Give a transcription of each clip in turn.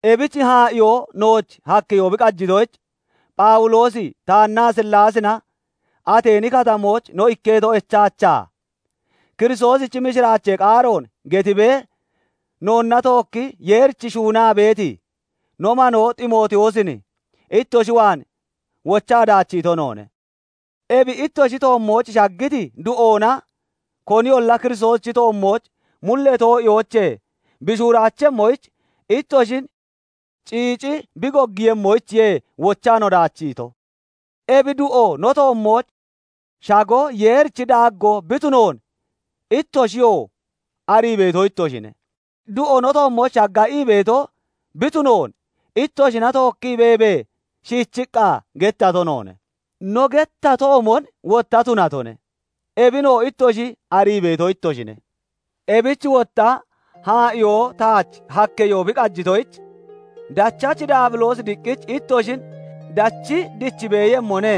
Ebich haa'iyo nooch hakkeyo bi qajitoyich, Phawuloosi taannaa Silaasina Ateeni Katamooch no ikketo echaachaa, Kiristoosichi mishiraachee qaaroon gettiibee noonna tookkii Yeerich shuunaa beeti no manoo Ximootiyoosin ittoshi waan wochaa daachiito noone; ebi ittoshi toommooch shaggiti du'oona koniyolla Kiristoosichi toommooch mullee too'iyoochee bi shuuraachemmoyich ittoshin ciici bi goggiiyemmoyichiye wochaa no daachiito. Ebi du'o no toommooch shago Yeerichi daaggoo bi tunoon ittoshiyoo arii beeto ittoshine. Du'o no toommooch shagga ii beeto bi tunoon ittoshina tookkii beebee shiichiqqa gettato noone; no gettatoomon wotta tunatone; ebinoo ittoshi arii beeto ittoshine. Ebich wotta haa'iyoo taach hakkeyoo bi qajitoyich, "Dachachi Daabiloosi diqqich ittoshin dachi dichi beeyemmone;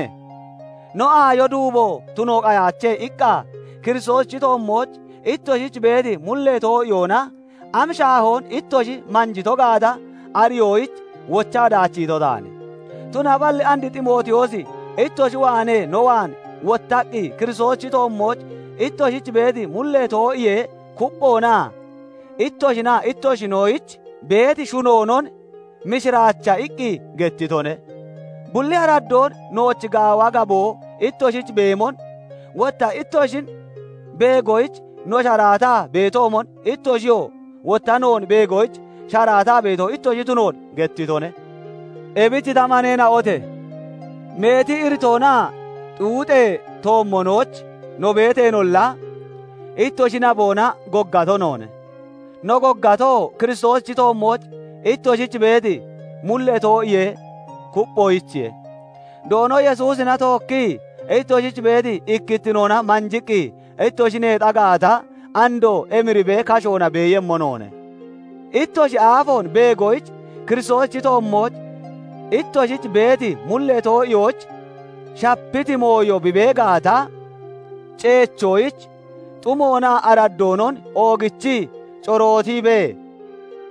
no aayo duubo tuno qayaache" iqqa Kiristoosichi toommooch ittoshich beeti mullee too'iyoona am shaahoon ittoshi manjito gaata ariyoyich wochaa daachiito taane. Tunaballi and Ximootiyoosi ittoshi waanee no waan wottaqqi Kiristoosichi toommooch ittoshich beeti mullee too'iyee kupphoonaa ittoshinaa ittoshinoyich beeti shunoonon "Mishiraacha" iqqi gettitone; bulli araddoon nooch gaawa gaboo ittoshich beemon, wotta ittoshin beegoyich no sharaataa beetoomon, ittoshiyoo wotta noon beegoyich sharaataa beeto ittoshi tunoon gettitone. Ebich ta maneena'ote! Meeti iritoonaa xuuxee toommonooch no beeteenolla, ittoshi naboona goggato noone; no goggatoo, Kiristoosichi toommooch ittoshich beeti mullee too'iyee kupphoyichiye. Doono Yesuusina tookkii ittoshich beeti ikkittinoona manjiqqi ittoshi neexa gaata, andoo emiribee kashoona beeyemmo noone. Ittoshi aafoon beegoyich, Kiristoosichi toommooch ittoshich beeti mullee too'iyooch shapiti mooyo bi bee gaata ceechoyich, xumoonaa araddoonon oogichii corootiibee,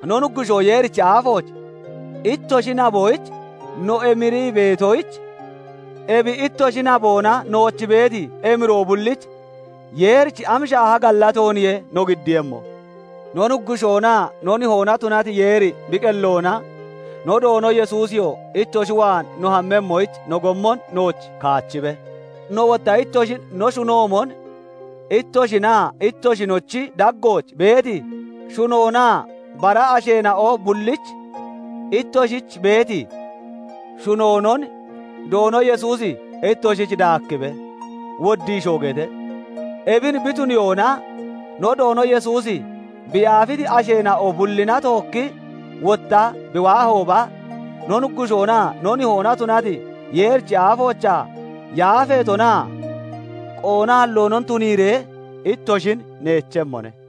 no Nuggushoo Yeerichi aafooch ittoshi naboyich no emirii beetoyich, ebi ittoshi naboona nooch beeti emiroo bullich Yeerich am shaaha gallatooniye no giddiiyemmo? No Nuggushoonaa no Nihoona tunati Yeeri bi qelloona, no Doono Yesuusiyoo ittoshi waan no hammemmoyich no gommon nooch kaachibe; no wotta ittoshin no shunoomon, ittoshinaa ittoshinochi daggooch beeti shunoonaa bara asheena'o bullich ittoshich beeti shunoonon Doono Yesuusi ittoshich daakkibe; woddiishoo gete. Ebin bi tuniyoona no Doono Yesuusi bi yaafiti asheena'o bullina tookkii wottaa bi waahooba, no Nuggushoonaa no Nihoona tunati Yeerichi aafoochaa yaafeetonaa qoonaalloonon tuniiree ittoshin neechemmone.